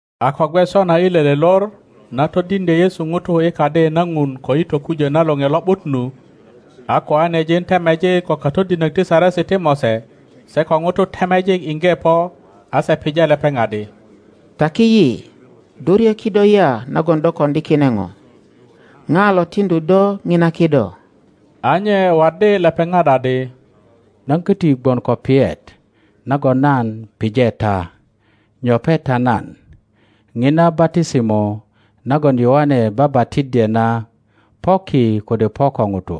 A ko gwe sona i lele lor, na todiŋdye Yesu ŋutu i Kadi na Ŋun ko i tokujo na Loŋe Lo ’but nu, a koanejin temejik ko katodinök ti Saresi ti Mose se ko ŋutu temejik iŋge po, a je pije lepeŋ adi, Taki yi, do ryö kido ya nagon do koŋdi kine ŋo? Pija lo tiŋdu do ŋina kido? A nye waddi lepeŋat adi, Nan köti gwon ko piyet nagon nan pije ta; nyoŋe ta nan. Ŋina batisimo nagon Yoane babatiddye na po ki kode po ko ŋutu?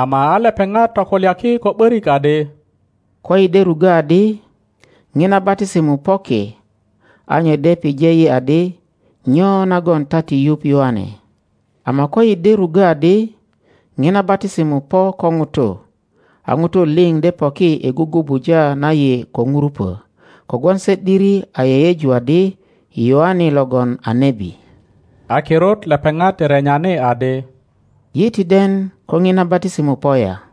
Ama a lepeŋat tokulyaki ko ’börik adi, Koyi de ruggö adi, Ŋina batisimo po ki, a nye de pije yi adi, Nyo nagon ta ti yuŋ Yoane? Ama koyi de ruggo adi, ŋiria batisimo po ko nutu, a ŋutu liŋ de poki i gugubuja na yi ko ŋurupo; kogwon se ’diri a yeyeju adi, Yoane logon a nebi. A kirut lepeŋat renyani adi, Yi ti den ko ŋina batisimo po ya.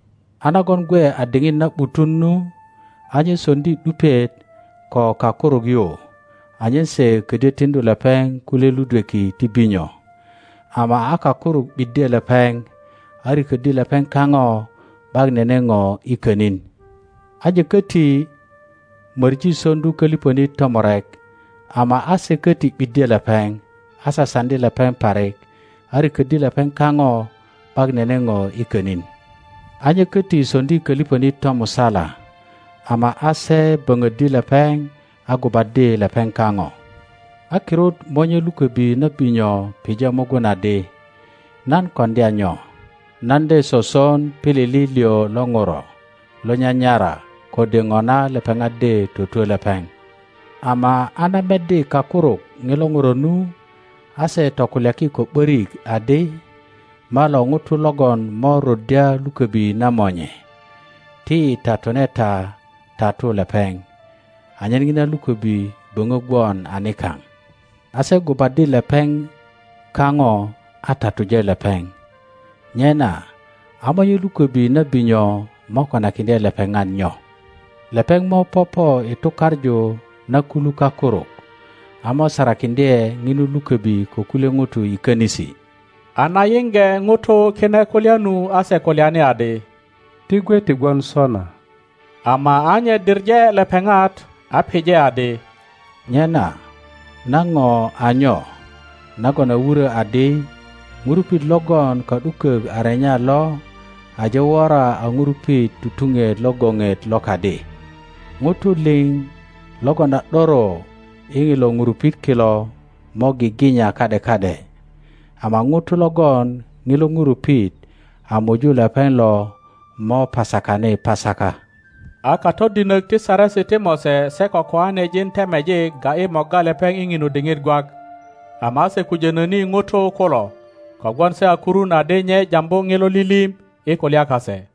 A nagon gwe a diŋit na ’butun nu, a nye soŋdi ’dupiet ko kakuruk yu anyen se kodyö tiŋdu lepeŋ kulye ludweki ti binyo. Ama a kakuruk ’biddye lepeŋ, a riköddi lepeŋ kaŋo ’bak nene ŋo i könin. A nye köti möŋi soŋdu köliŋönit tomurek, ama a se köti ’biddye lepeŋ, a sasaŋdi lepeŋ parik, a rikoddi lepeŋ kaŋo ’bak nene ŋo i könin. a nye koti soŋdi köliŋönit tomusala, ama a se böŋoddi lepeŋ a gubaddi lepeŋ kaŋo. a kirut monye lukobi na binyo pije mugun adi, Nan koŋdya nyo? Nan de soson pilili liŋ lo ŋuro lo nyanyara, kode ŋona lepeŋat de twotwö lepeŋ. Ama a na meddi kakuruk ŋilo ŋuro nu, a se tokulyaki ko ’börik adi, Malo ŋuto logon mo ruddya lukobi na monye. Ti yi tatune ta tatu lepeŋ, anyen ŋina luköbi böŋö gwon a nikaŋ. A se gubaddi lepeŋ kaŋo a tatuje lepeŋ. Nyena a monye lukobi na binyo mo konakiŋdye lepeŋat nyo? Lepeŋ mo popo i tukaŋu na kulu kakuruk, a mo sarakiŋdye ŋinu lukobi ko kulye ŋutu i könisi. A na yiŋge ŋutu kine kulya nu a se kulyani adi, Ti gwe ti gwon sona! Ama a nye diŋe lepeŋat, a pije adi, Nyena na ŋo a nyo nagon a wuro adi, Ŋurupit logon ka ’dukok a renya lo aje wora a ŋurupit tutuŋet lo goŋet lo kadi? Ŋutu liŋ logon a ’doro i ŋilo ŋurupit kilo mo giginya ka ’de ka ’de, ama ŋuto logon ŋilo ŋurupit a muju lepeŋ lo mo pasakani pasaka. a katodinök ti Saresi ti Mose se ko koanejin temejik ga ’yi morga lepeŋ i ŋinu diŋit gwak, ama a se kujono ni ŋutu kulo, kogwon se a kurun adi nye jambu ŋilo lilim i kulya kase.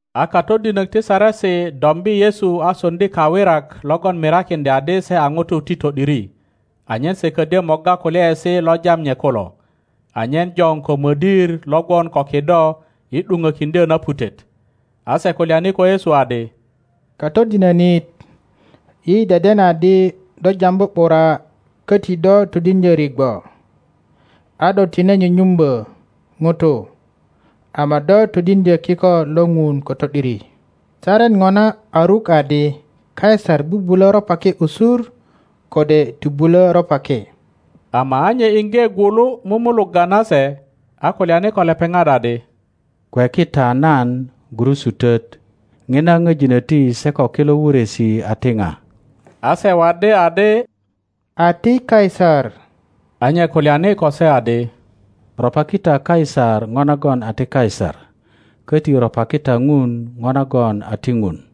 A katodinok ti Saresi dombi Yesu a soŋdi kawirak logon mirakiŋdya adi se a ŋutu ti to ’diri, anyen se ködyö morga kulyaesi lo jam nye kulo, anyen joŋ ko modir lo gwon ko kido i ’duŋokiŋdyo na putet. A se kulyani ko Yesu adi, Katodinonit, yi deden adi do jambu ’bura koti do todiŋdyo rigwo, a do tine nyunyumbö ŋutu, ama do todiŋdyö kiko lo Ŋun ko to ’diri. Saret ŋona a ruk adi Kaisar bubulo ropaki usur, kode ti bulo ropaki? Ama a nye iŋge gwulu mumulugga nase, a kulyani ko lepeŋat adi, Kweki ta nan gurusutot. Ŋina ŋo jinoti se ko kilo wuresi a ti ŋa? A se waddi adi a ti Kaisar. a nye kulyani ko se adi, Ropaki ta Kaisar ŋo nagon a ti Kaisar, köti ropaki ta Ŋun ŋo nagon a ti Ŋun.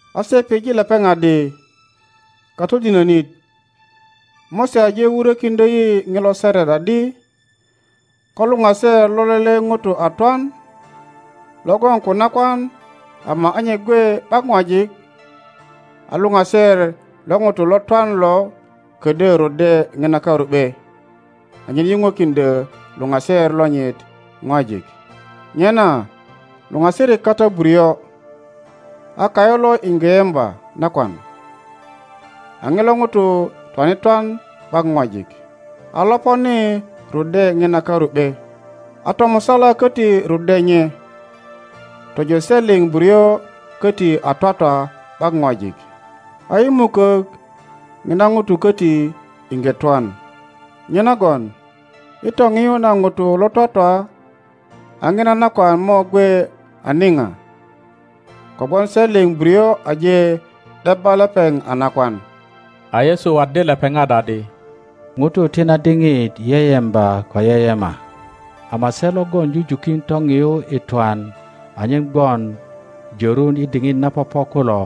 A se pije lepeŋ adi, Katodinonit, Mose aje wurökiŋdyo yi ŋilo saret adi, Ko luŋaser lo lele ŋuto a twan, lo gwon ko nakwan ama a nye gwe ’bak ŋwajik, a luŋaser lo ŋuto lo twan lo kodyö ruddya ŋina karu ’be anyen yuŋwekiŋdyöluŋaser lonyit ŋwajik. Nyena luŋasirik kata buryo, a kayu lo iŋge yemba nakwan, a ŋilo ŋuto twane twan ’bak ŋwajik; a loponi ruddye ŋina karu ’be, a tomusala köti ruddye nye, tojo se liŋ buryo köti a twatwa ’bak ŋwajik. a i mukök, ŋina ŋuto köti iŋge twan. Nyenagon i toŋiyu na ŋutu lo twatwa a ŋina nakwan mo gwe a niŋa? Kogwon se liŋ buryo aje ’debba lepeŋ a nakwan. A Yesu waddi lepeŋat adi, Ŋutu ti na diŋit yeyemba ko yeyema, ama se logon jujukin toŋiyu i twan anyen gwon jörun i diŋit na popo kulo,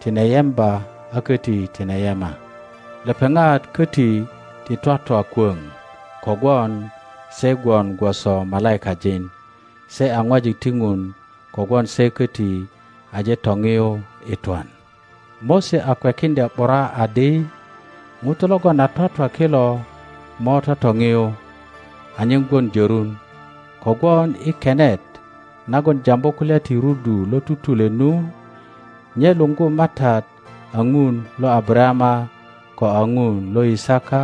tine yemba a köti tine yema. Lepeŋat koti ti twatwa kwöŋ kogwon se gwon gwoso malaikajin; se a ŋwajik ti Ŋun kogwon se köti aje toŋiyu i twan. Mose a kwekiŋdya ’bura adi ŋutu logon a twatwa kilo mo totoŋiyu anyen gwon jörun, kogwon i kenet nagon jambu kulya ti rudu lo tutule nu, nye luŋgu MATAT a Ŋun lo Abarayama, ko a Ŋun lo Yisaka,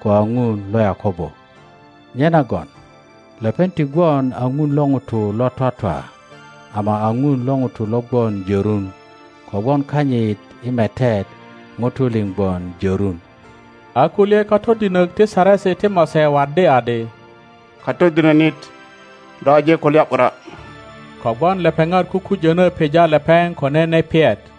ko a Ŋun lo Yakobo. Nyenagon lepeŋ ti gwon a Ŋun lo ŋutu lo twatwa, ama a Ŋun lo ŋutu lo gwon jörun; kogwon kanyit i metet ŋutu liŋ gwon jorun. A kulye katodinok ti Saresi ti Mose waddi adi, Katodinönit. do aje kulya ’bura; kogwon lepeŋat kukujonö pija lepeŋ ko nene piyet.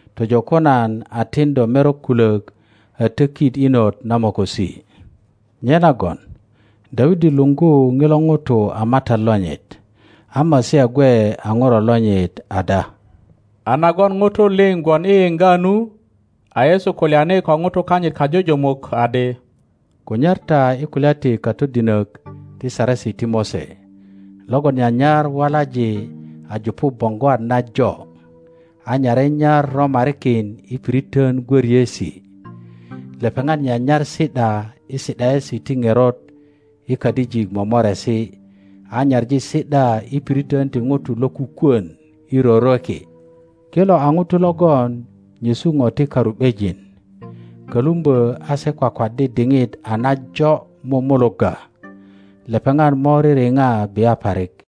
tojo ko nan a tin do merok kulök a tökit inot na mokosi. Nyenagon Dawidi luŋgu ŋilo ŋuto a MATAT lonyit, a Masia gwe a ŋuro lonyit ada? A nagon ŋutu liŋ gwon i yiŋga nu, a Yesu kulyani ko ŋutu kanyit kajujumuk adi, Kunyar ta i kulya ti katodinök ti Saresi ti Mose logon nyanyar walaŋ a jupu boŋgwat najo, a nyare nyar romarikin i piritön gwöriesi. Lepeŋat nyanyar si ’da i si ’daesi ti ŋerot i kadijik momoresi, a nyaŋi si ’da i piritön ti ŋutu lokukwön i rorweki. Kilo a ŋutu logon nyesu ŋo ti karu ’bejin, kölumbö a se kwakwaddi diŋit a najo mumulugga. Lepeŋat mo ririŋa bia parik.